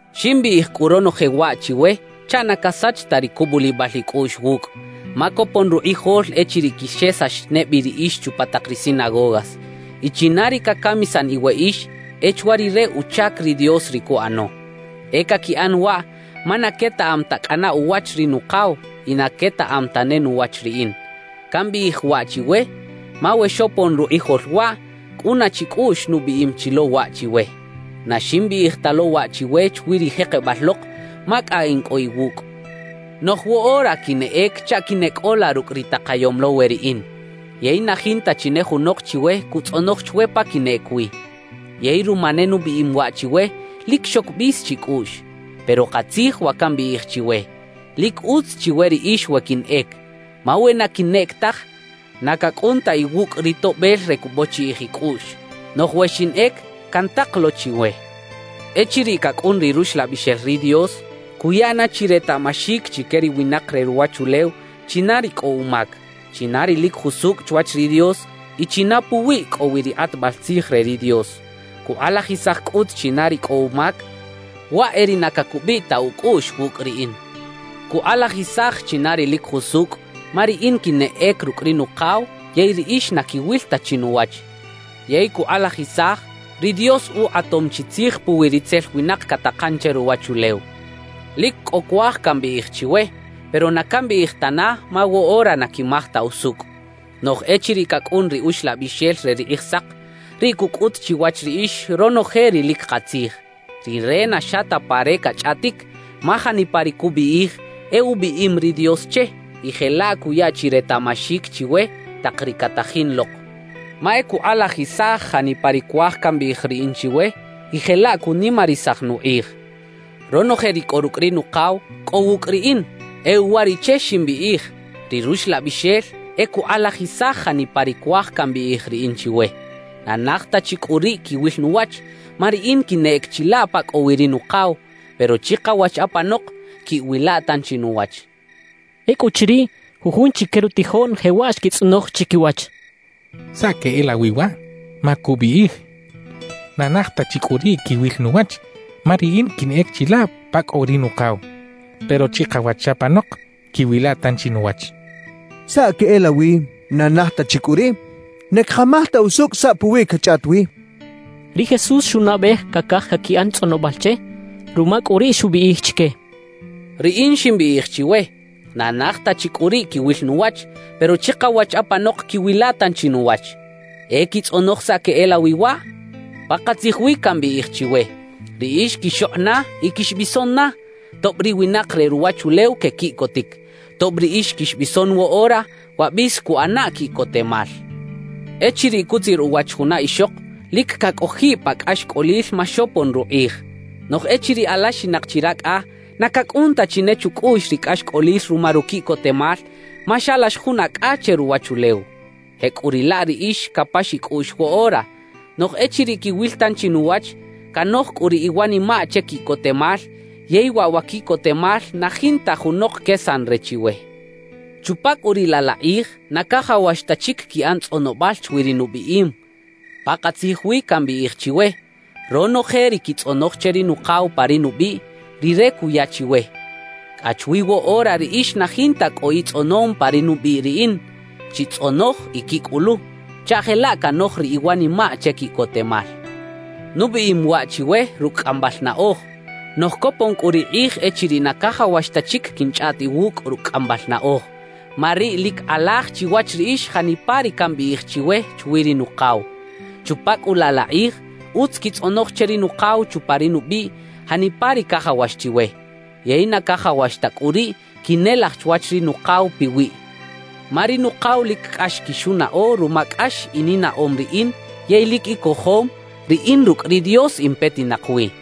»Ximbiꞌij cꞌu ronoje waꞌ chiwe chaꞌ na casach ta ri cubulibal icꞌuꞌx wucꞌ. Ma copon rukꞌijol echiriꞌ quixesax ne bi riꞌix chupa tak ri sinagogas. Y china ri cacamisan iweꞌix, e chwa rire uchac ri Dios ri cuꞌano. E caquiꞌan waꞌ ma na quetaꞌam ta cꞌana uwach ri Nukaw y na quetaꞌam tane nuwach riꞌin. Cambiꞌij waꞌ chiwe, ma we xopon rukꞌijol waꞌ, cꞌuna chicꞌuꞌx nubiꞌim chi lo waꞌ chiwe. »Na ximbiꞌij ta lo waꞌ chiwe chwi ri jekebal lok, ma cꞌa in cꞌo iwucꞌ. Noꞌj woꞌora quinꞌec chaꞌ quineꞌcꞌola rucꞌ ri takayom lo we riꞌin, yey na jinta chi ne junok chiwe cutzꞌonoj chwe pa quinꞌec wi. Yey ruma ne nubiꞌim waꞌ chiwe, lic xoc bis chicꞌuꞌx. Pero katzij wa cambiꞌij chiwe: Lic utz chiwe riꞌix we quinꞌec. Ma we na quinꞌec taj, na cacꞌun ta iwucꞌ ri Toꞌbel re cubochiꞌij icꞌuꞌx. Noꞌj we xinꞌec, cantak lo chiwe. »Echiriꞌ cacꞌun ri Ruxlabixel ri Dios, cuya na chi retaꞌmaxic chique ri winak re ruwachulew china ri cꞌo umac, china ri lic jusucꞌ chwach ri Dios y china puwiꞌ cꞌo wi ri kꞌatbal tzij re ri Dios. Cukꞌalajisaj cꞌut china ri cꞌo umac: Waꞌ e ri na cacubiꞌ ta ucꞌuꞌx wucꞌ riꞌin. Cukꞌalajisaj china ri lic jusucꞌ, ma riꞌin quinꞌec rucꞌ ri Nukaw yey riꞌix na quiwil ta chi nuwach. Yey cukꞌalajisaj, ri Dios ukꞌatom chi tzij puwi ritzel winak catakan che ruwachulew. »Lic cꞌo cuaj cambiꞌij chiwe, pero na cambiꞌij tana, ma woꞌora na quimaj ta usucꞌ. Noꞌj echiriꞌ cacꞌun ri Uxlabixel re ri Kꞌijsak, riꞌ cucꞌut chiwach riꞌix ronoje ri lic katzij. Rire na xa ta pa re cachꞌaꞌtic, ma janipa ri cubiꞌij e ubiꞌim ri Dios che y jelaꞌ cuya chi retaꞌmaxic chiwe tak ri catajin lok. Ma e cukꞌalajisaj janipa ri cuaj cambiꞌij riꞌin chiwe, y jelaꞌ cunimarisaj nukꞌij. Ronoje ri cꞌo rucꞌ ri Nukaw, cꞌo wucꞌ riꞌin; e uwariꞌche ximbiꞌij ri Ruxlabixel e cukꞌalajisaj janipa ri cuaj cambiꞌij riꞌin chiwe. »Na naj ta chi cꞌu riꞌ quiwil nuwach, ma riꞌin quinꞌec chilaꞌ pa cꞌo wi ri Nukaw; pero chikawach apanok quiꞌwila tanchi nuwach —xchaꞌ. Ecꞌuchiriꞌ, jujun chique rutijoꞌn jewaꞌ xquitzꞌonoj chiquiwach: «¿Saꞌ queꞌelawi waꞌ? Ma cubiꞌij: “Na naj ta chi cꞌu riꞌ quiwil nuwach, ma riꞌin quinꞌec chilaꞌ pa cꞌo wi ri Nukaw; pero chikawach apanok quiꞌwila tanchi nuwach.” ¿Saꞌ queꞌelawi: “Na naj ta chi cꞌu riꞌ”? Na cakamaj ta usucꞌ saꞌ puwi cachꞌaꞌt wi» xechaꞌ. Ri Jesús xunaꞌbej cacaj caquiꞌan tzꞌonobal che. Ruma cꞌu riꞌ xubiꞌij chique: —Riꞌin ximbiꞌij chiwe: “Na naj ta chi cꞌu riꞌ quiwil nuwach, pero chikawach apanok quiꞌwila tanchi nuwach.” ¿E quitzꞌonoj saꞌ queꞌelawi waꞌ? Pakatzij wi cambiꞌij chiwe: Riꞌix quixokꞌ na y quixbison na, tob ri winak re ruwachulew quequiꞌcotic. Tob riꞌix quixbison woꞌora, wa bis cuꞌana quiꞌcotemal. »Echiriꞌ cutzir uwach juna ixok, lic cacꞌojiꞌ pa cꞌaxcꞌolil ma xopon rukꞌij. Noꞌj echiriꞌ alaxinak chi racꞌa, na cacꞌun ta chi ne chucꞌuꞌx ri cꞌaxcꞌolil ruma ruquiꞌcotemal, ma xalax jun acꞌa che ruwachulew. Jecꞌuriꞌlaꞌ riꞌix capax icꞌuꞌx woꞌora; noꞌj echiriꞌ quiwil tanchi nuwach, canoj cꞌu ri iwanimaꞌ che quiꞌcotemal yey waꞌ wa quiꞌcotemal na jinta junok quesan re chiwe. Chupa cꞌu riꞌ laꞌ la kꞌij na cajawax ta chic quiꞌan tzꞌonobal chwi ri nubiꞌim. »Pakatzij wi cambiꞌij chiwe: Ronoje ri quitzꞌonoj che ri Nukaw pa ri nubiꞌ, Rire cuya chiwe. Cꞌa chwi woꞌora riꞌix na jinta cꞌo itzꞌonom pa ri nubiꞌ riꞌin. Chitzꞌonoj y quicꞌulu, chaꞌ jelaꞌ canoj ri iwanimaꞌ che quiꞌcotemal. »Nubiꞌim waꞌ chiwe rucꞌ cꞌambal naꞌoj; noꞌj copon cꞌu ri kꞌij echiriꞌ na cajawax ta chic quinchꞌaꞌt iwucꞌ rucꞌ cꞌambal naꞌoj, ma riꞌ lic kꞌalaj chiwach riꞌix janipa ri cambiꞌij chiwe chwi ri Nukaw. Chupa cꞌu laꞌ la kꞌij, utz quitzꞌonoj che ri Nukaw chupa ri nubiꞌ janipa ri cajawax chiwe. Yey na cajawax ta cꞌu riꞌ quinelaj chwach ri Nukaw piwiꞌ, ma ri Nukaw lic cꞌax quixunaꞌo ruma cꞌax ininaꞌom riꞌin yey lic icojom, riꞌin rucꞌ ri Dios in petinak wi.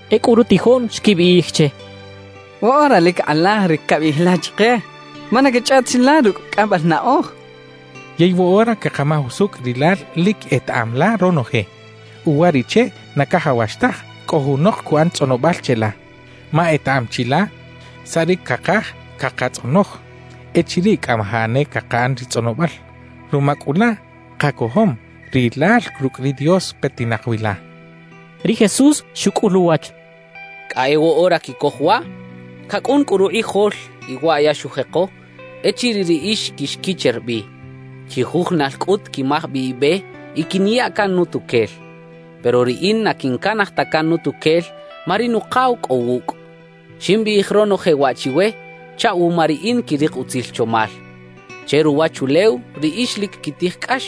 Ecꞌu rutijoꞌn xquibiꞌij che: —Woꞌora lic kꞌalaj ri cabiꞌij la chike, ma na cachꞌaꞌt ta chi la rucꞌ cꞌambal naꞌoj. Yey woꞌora cakamaj usucꞌ rilal lic etaꞌam la ronoje. Uwariꞌche na cajawax taj cꞌo junok cuꞌan tzꞌonobal cheꞌla, ma etaꞌam chi la saꞌ ri cakaj cakatzꞌonoj echiriꞌ cꞌamajaꞌ ne cakaꞌan ri tzꞌonobal. Ruma cꞌu laꞌ, kacojom rilal rucꞌ ri Dios petinak wi la —xechaꞌ. Ri Jesús xucꞌul uwach: —¿Cꞌa e woꞌora quicoj waꞌ? Cacꞌun cꞌu rukꞌijol y waꞌ ya xujeko echiriꞌ riꞌix quixquicher bi. Chijujunal cꞌut quimaj bi ibe y quiniya can nutuquel. Pero riꞌin na quincanaj ta can nutuquel, ma ri Nukaw cꞌo wucꞌ. »Ximbiꞌij ronoje waꞌ chiwe chaꞌ wuma riꞌin quirik utzil chomal. Che ruwachulew riꞌix lic quitij cꞌax.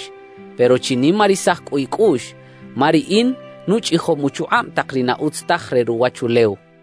Pero chinimarisaj cꞌu icꞌuꞌx, ma riꞌin nuchꞌijom uchukꞌab tak ri na utz taj re ruwachulew —xchaꞌ.